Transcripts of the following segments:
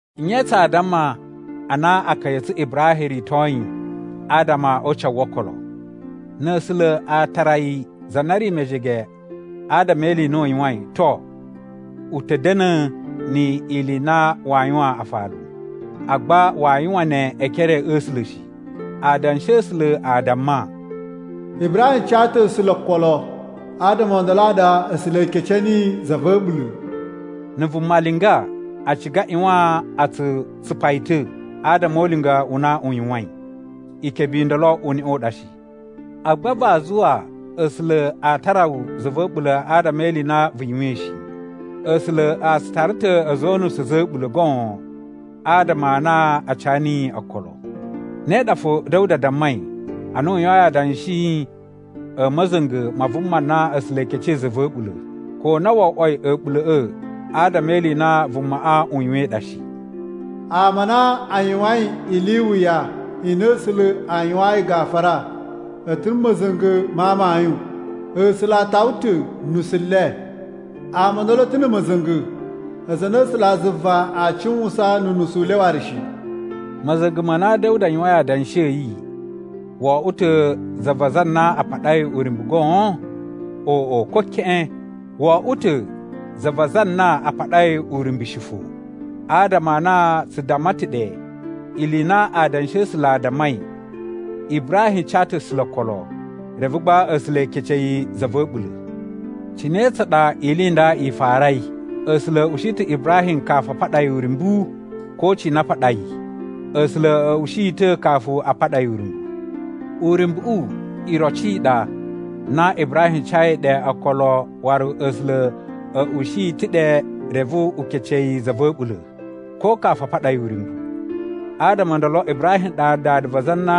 Nye tsaa damma a na akaya a̱ tsu Ibrahim ritoi adama o ucawu wo okolo? Na̱ A̱sula̱ a tara yi za na ri mejege adama e ili i na u yuwain, to, u ta̱ da̱na̱ ni ili i na waa yuwaan afalu. Agba waa yuwan ne e ekere a̱ A̱sula̱ shi. Adanshi a̱ A̱sula̱ a damma, “Ibrahim ca ta̱ A̱sula̱ okolo, adama o ndolo a ɗa A̱sula̱ a kece niyi za va̱ a̱ɓula̱.” Na̱ vuma linga, a ciga a ꞌyuwan a tsu tsupa yi ta̱ adama o ulinga u na u yuwain. Ikebe i ndolo uneꞌe u ɗa shi. Agba vaa zuwa A̱sula̱ a tara wu za va̱ a̱ɓula̱ adama e ili i na vu yuwain shi. A̱sula̱ a tsu tara ta̱ a̱za̱ o unusu a̱za̱ a̱ɓula̱ goon adama a na a ca niyi okolo. Ne ɗa fo Da̱wuda dammai ana u yuwain adanshi a̱ ma̱za̱nga̱ ma vuma na A̱sula̱ e kecei za va̱ a̱ɓula̱, ko na wo oꞌwoi a̱ɓula̱ꞌa̱ adama e ili i na vumaꞌa u yuwain ɗa shi: “Ama a na a yuwain ili i wuya i na A̱sula̱ a yuwayin gafura, a̱ ta̱ na̱ ma̱za̱nga̱ ma amayun. A̱sula̱ a tawa ta̱ unusu u le. Ama o ndolo a̱ ta̱ na̱ ma̱za̱nga̱, aza a na A̱sulazuva aa cuwusan nu unusu u le waru shi.” Ma̱za̱nga̱ ma na Da̱wuda yuwain adanshi a̱ yi, wo oꞌwo ta̱ za va aza a na a paɗai uryumbu goon? Oꞌo, ko keꞌen! Wo oꞌwo ta̱ za va aza a na a paɗai uryumbu shi fo. Adama a na tsu damma ta̱ ɗe ili i na Adanshi a̱ A̱sula̱ a dammai, “Ibrahim ca ta̱ A̱sula̱ okolo, reve gba A̱sula̱ e kece yi za va̱ a̱ɓula̱.” Cine tsa ɗa ili i nda i farai? A̱sula̱ a̱ ushi ta̱ Ibrahim kafu a paɗa yi uryumbu, ko cina a paɗa yi? A̱sula̱ a̱ ushi yi ta̱ kafu a paɗa yi uryumbu. Uryumbuꞌu iroci i ɗa na Ibrahim cayi ɗe okolo waru A̱sula̱ a̱ ushi yi ta̱ ɗe reve u kece yi za va̱ a̱ɓula̱, ko kafu a paɗa yi uryumbu. Adama o ndolo Ibrahim ɗa dada va aza a na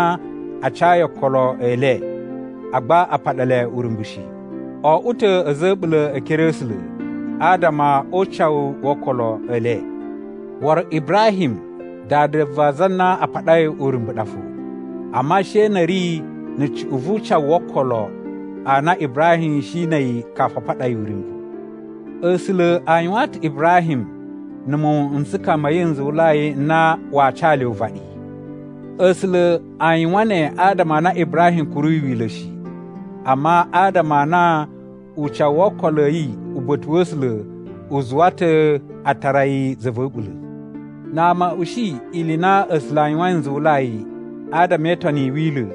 a cayi okolo e le, agba a paɗa le uryumbu shi. O oꞌwo ta̱ a̱za̱ a̱ a̱ɓula̱ e ekere a̱ A̱sula̱ adama o ucawu wo okolo e le. Waru Ibrahim dada va aza a na a paɗai uryumbu ɗa fo, amma she na̱ a̱ ri na̱ cuꞌun vu ucawu wo okolo a na Ibrahim shi na̱ a̱yi kafu a paɗa yi uryumbu. A̱sula̱ a yuwaan ta̱ Ibrahim na̱ muwun n tsukaya ma̱ yi nzuwulai n na waa ca le uvaɗi. A̱sula̱ a yuwan ne adama a na Ibrahim kuruyi Wila̱ shi, amma adama a na ucawu wo okolo a̱ yi uba̱ta̱ wa̱ A̱sula̱ u zuwa ta̱ a tara yi za va̱ a̱ɓula̱. Na ama a̱ ushi ili i na A̱sula̱ a yuwain nzuwulai adama e itoni i Wila̱,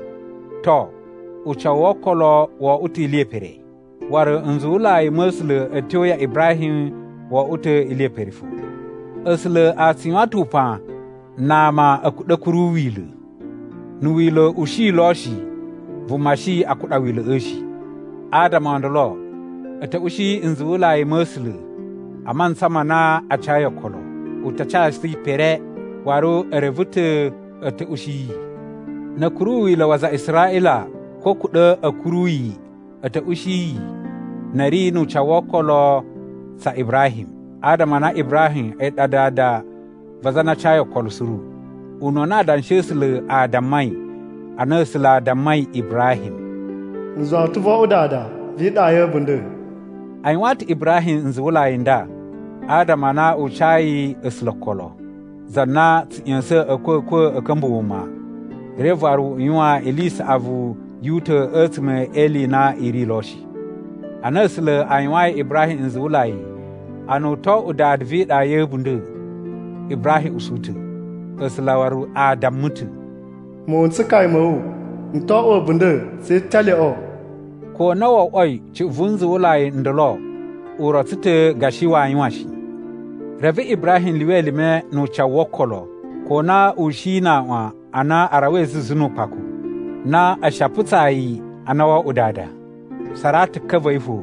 to, ucawu wo okolo wo oꞌwo ta̱ ili ye pere. Waru nzuwulai ma̱ A̱sula̱ a̱ tyo ya Ibrahim wo oꞌwo ta̱ ili ye pere fo. A̱sula̱ a tsu yuwan ta̱ upan na ama a̱ kuɗa̱ a̱ kuru Wila̱. Na̱ wila̱ u shi lo shi, vuma shi a kuɗa wila̱ꞌa̱ shi. Adama o ndolo a̱ ta̱ ushi nzuwulai ma̱ A̱sula̱ a mantsa ma na a cayi okolo. U ta casu yi pere, waru e reve ta̱ a̱ ta̱ ushi yi. Na̱ a̱ kuru Wila̱ wa aza a Israꞌila, ko a̱ kuɗa̱ a̱ kuru yi, a̱ ta̱ ushi yi na̱ a̱ ri nu ucawu wo okolo tsa Ibrahim. Adama a na Ibrahim a̱yi ɗa dada va aza a na a cayi okolo suru. Ununa Adanshi a̱ A̱sula̱ a dammai ana A̱sula̱ a dammai Ibrahim, “N zuwa wu ta̱ vo oꞌwo dada vi iɗa ya̱ a̱bunda̱.” A yuwaan ta̱ Ibrahim nzuwulai n nda adama a na u cayi A̱sula̱ okolo, za na tsu ꞌya̱sa̱n a̱kwa̱kwa̱ a̱ ka̱mba̱ wuma reve waru u yuwan ili i saꞌavu yu uta̱ a̱tsuma̱ e ili i na i ri lo shi. Ana A̱sula̱ a yuwayin Ibrahim nzuwulai a na u to oꞌwo dada vi iɗa ya̱ a̱bunda̱, Ibrahim usu ta̱. A̱sula̱ waru a damma ta̱, “Muwun n tsukaya ma̱ wu n to oꞌwo a̱bunda̱ tse italyoꞌo,” ko na wo oꞌwoi cuꞌun vu nzuwulai n ndolo u rotso ta̱ gashi waa yuwan shi. Reve Ibrahim lyuwa elime nu ucawu wo okolo, ko na u shi na aꞌwan a na a rawai zuzu nu ukpaku, na a̱ shi a putsaa yi a na wo oꞌwo dada. Saratu ka va̱ yi fo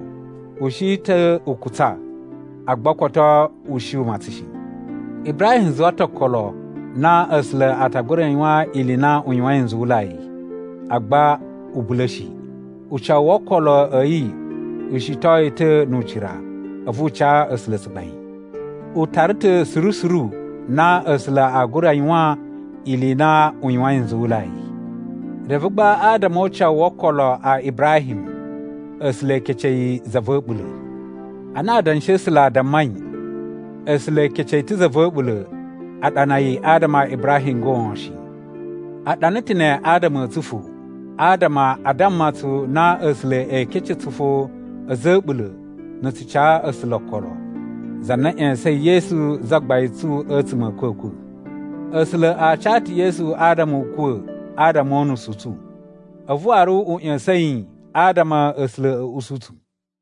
u shi ta̱ u kutsa, agba koto u shi u matsan shi. Ibrahim zuwa ta̱ okolo na A̱sula̱ a ta gura yuwan ili i na u yuwain nzuwulai, agba u bula̱ shi. Ucawu wo okolo a̱ yi u shiton yi ta̱ nu ucira, a̱vu u ca A̱sula̱ tsugbain. U tara ta̱ suru suru na A̱sula̱ aa gura yuwan ili i na u yuwain nzuwulai. Reve gba adama o ucawu wo okolo a Ibrahim, “A̱sula̱ e kece yi za va̱ a̱ɓula̱.” Ana Adanshi a̱ A̱sula̱ a dammai “A̱sula̱ e kece yi ta̱ za va̱ a̱ɓula̱,” a ɗana yi adama a Ibrahim goon shi. A ɗana ta̱ ne adama a̱ tsu fo, adama a damma tsu na A̱sula̱ ee kece tsu fo a̱za̱ a̱ a̱ɓula̱ na̱ tsu ca A̱sula̱ okolo, za na ꞌya̱sa̱in Yesu Zagbain tsu a̱tsuma̱ a̱ a̱kwa̱kwa̱. A̱sula̱ a ca ta̱ Yesu adama u kuwa̱ adama o unusu u tsu, a̱vu waru u ꞌya̱sa̱n yi, adama A̱sula̱ a̱ usu tsu.